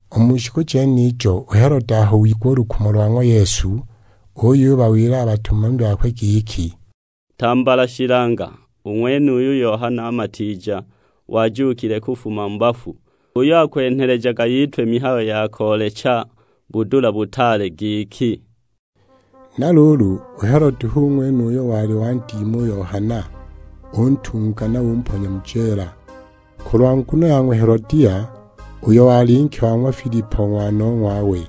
U mu shiku jenijo u Helode aho wigwa u lukumo lwa ng'wa Yesu, uyubawila a batumami bakwe giki, "Tambala shilanga u ng'wenuyu Yohana Matiija, wajuukile kufuma mu bafu. H'uyo akwenhelejaga yitwe mihayo ya koolecha budula butaale giki!" Na luulu, u Helode hu ng'wene uyo wali wandima u Yohana untunga na umponya mu jeela, kulwa nguno ya ng'wa Helodia, uyo wali nke wa ng'wa Filipo ng'wanong'wawe.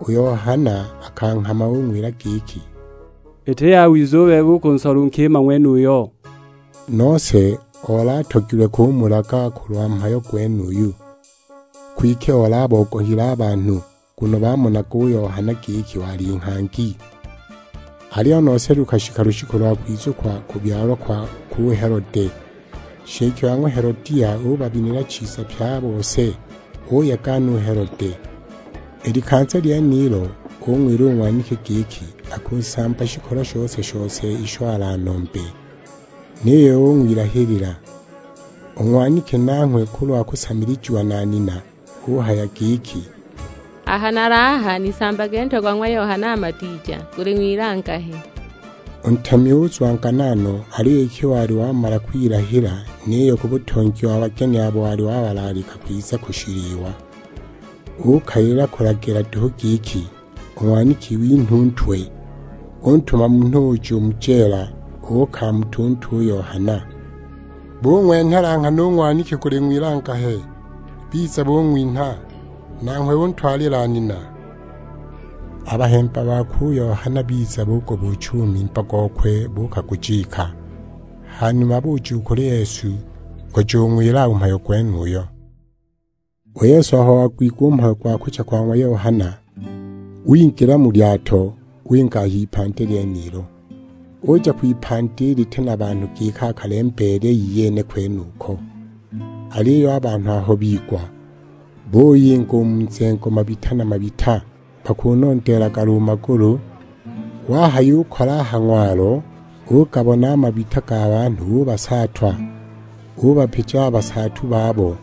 U Yohana akanghama ung'wila giki, "Iti yawiza u bebe u kunsola u nkima ng'wenuyo!" Nose oli atogilwe kumulaga kulwa mhayo gwenuyo, kwike oli abogohile a banhu, nguno bamonaga u Yohana giki wali nghangi. Aliyo nose lukashika lushiku lo kwizukwa kubyalwa kwakwe u Helode, nshike wa ng'wa Helodia ubabinila chiza pye a bose, uyega no u Helode. I likanza lyenilo, ung'wila u ng'waniki giki akunsamba shikolo shose-shose isho alanombe; niyo ung'wilahilila. U ng'waniki nanghwe kulwa kusamilijiwa na nina, uhaya giki; "Aha nali aha nisambage ntwe go ng'wa Yohana Matiija, guli ng'wilangahe!" U ntemi uzwangana no, aliyo iki wali wamala kwilahila, niyo ku butongi wa bageni abo wali wabalaalika kwiza ku shiliwa, ukalila kulagila duhu giki u ng'waniki inhwe u ntwe! Untuma munhu uja u mu jeela, uukamuta u ntwe u Yohana! Bung'wenhela nghana u ng'waniki guli ng'wilangahe, biza bung'winha; nanghwe untwalila nina! A bahemba bakwe u Yohana biza bugubuucha u mimba gokwe buukagujika, ha numa buja u kuli Yesu, kujung'wila u mhayo gwenuyo. U Yesu aho wagwigwa u mhayo gwa kucha kwa ng'wa Yohana, wingila mu lyato winga a h'ipandi lyenilo; uja kwipandi liti na banhu giki akalembeele iyene kwenuko. Aliyo a banhu aho bigwa buyinga u mu mizengo mabita na mabita, bakunondeelaga lo magulu. Wahayukola a ha ng'walo ugabona a mabita ga banhu ubasaatwa, ubapija a basaatu babo.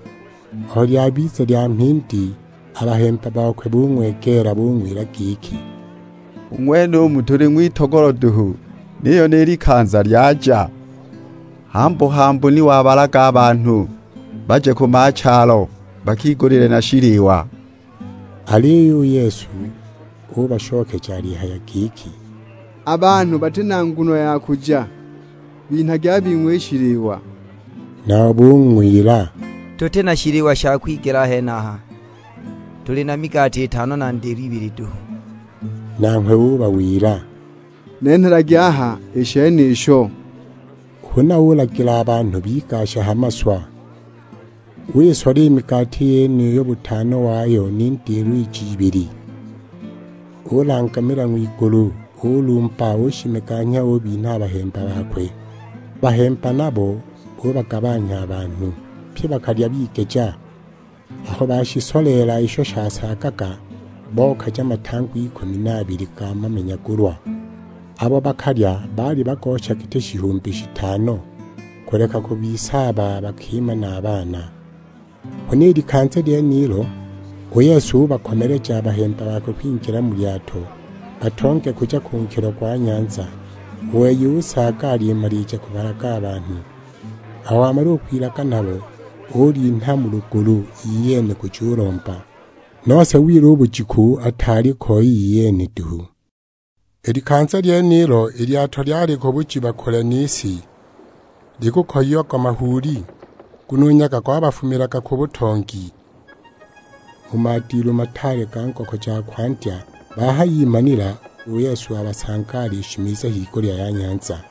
Aho lyabiza lya mhindi, a bahemba bakwe bung'wegeela bung'wila giki, "U ng'wenumu tuli ng'witogolo duhu, niyo ni likanza lyaja. Hambu-hambu ni wabalaga a banhu baje ku machalo bakigulile na shiliwa!" Aliyo u Yesu ubashokeja alihaya giki, "A banhu bati na nguno ya kuja, binhagi a bing'we i shiliwa." Nabo bung'wila, "Tuti na shiliwa sha kwigela a henaha, tuli na migati itano na ndilo ibili duhu." Nanghwe ubawila, "Nenhelagi aha i shenisho." Huna ulagila a banhu bigashe ha maswa. Wisola i migati yeniyo butano wayo ni ndilo ij'ibili. Ulangamila ng'wigulu, ulumba, ushimeganya ubinha a bahemba bakwe, a bahemba nabo bubagabanhya a banhu. Pye bakalya bigeja; aho bashisoleela isho shikasaaga, bokaja matangwa ikumi na abili ga mamenyagulwa. Abo bakalya baali bagosha giti shihumbi shitano, kuleka kubisaaba a bakima na a baana. Huna i likanza lyenilo, u Yesu ubakomeleja a bahemba bakwe kwingila mu lyato, batonge kuja ku nkilo gwa nyanza. U wei usaaga alimalija kubalaga a banhu. Aho wamala u kwilaga nabo, ulinha mu lugulu iyene kujulomba; nose wila u bujiku ataali ko iyene duhu. I likanza lyenilo i lyato lyali ku bujiba kule ni si, likukoyiagwa mahuuli, nguno u nyaga gwabafumiilaga ku butongi. Mu madilu mataale ga ngoko ja kwandya, bahayimanila u Yesu wabasanga alishimiza higulya ya nyanza.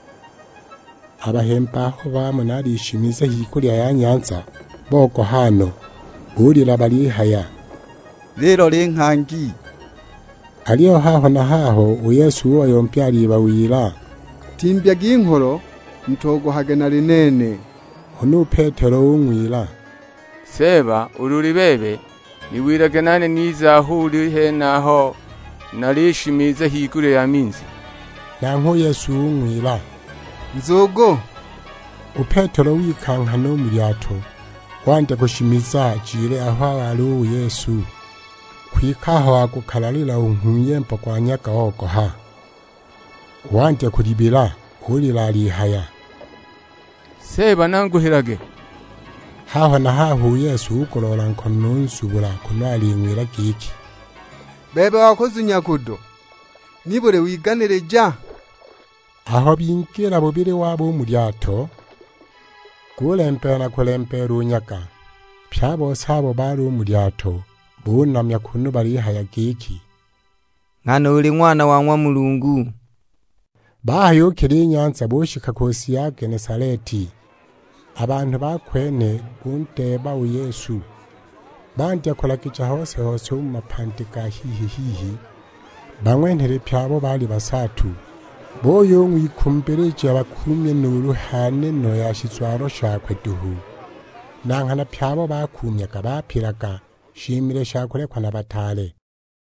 A bahemba aho bamona alishimiza higulya ya nyanza, bogoha no. Bulila balihaya, "Lilo linghangi!" Aliyo haho na haho u Yesu ubayombya alibawila; "Timbyagi ngholo, mutogohage nali nene." Huna u Petelo ung'wila, "Seeba ulu uli bebe, niwilage nane nize aho uli henaho nalishimiza higulya ya minzi." Nanghwe u Yesu ung'wila, "Nzugu." U Petelo wika nghana u mu lyato, wandya kushimiza ajile aho wali u Yesu. Kwike aho wagukalalila u nghuyembo gwa nyaga ogoha, wandya kulibila; ulila alihaya, "Seeba nanguhilage!" Haho na haho u Yesu ugoloola nkono unzubula, kunu aling'wila giki, "Bebe wa kuzunya kudo, nibuli wiganilija?" Aho bingila bubili wabo u mu lyato, gulembeela na kulembeela u nyaga. Pye a bose abo baali u mu lyato bunamya kunu balihaya giki, "Nghana uli Ng'wana wa ng'wa Mulungu!" Bahayukila i nyanza, bushika ku si ya Genesaleti. A banhu ba kwene bundeeba u Yesu, bandya kulagija hose-hose u mu mapandi ga hihi-hihi, bang'wenhele pye abo baali basaatu. Buyung'wikumbilija bakuumye nuulu ha neno ya shizwalo shakwe duhu. Na nghana pye abo bakuumyaga bapilaga.Shimile sha kulekwa na bataale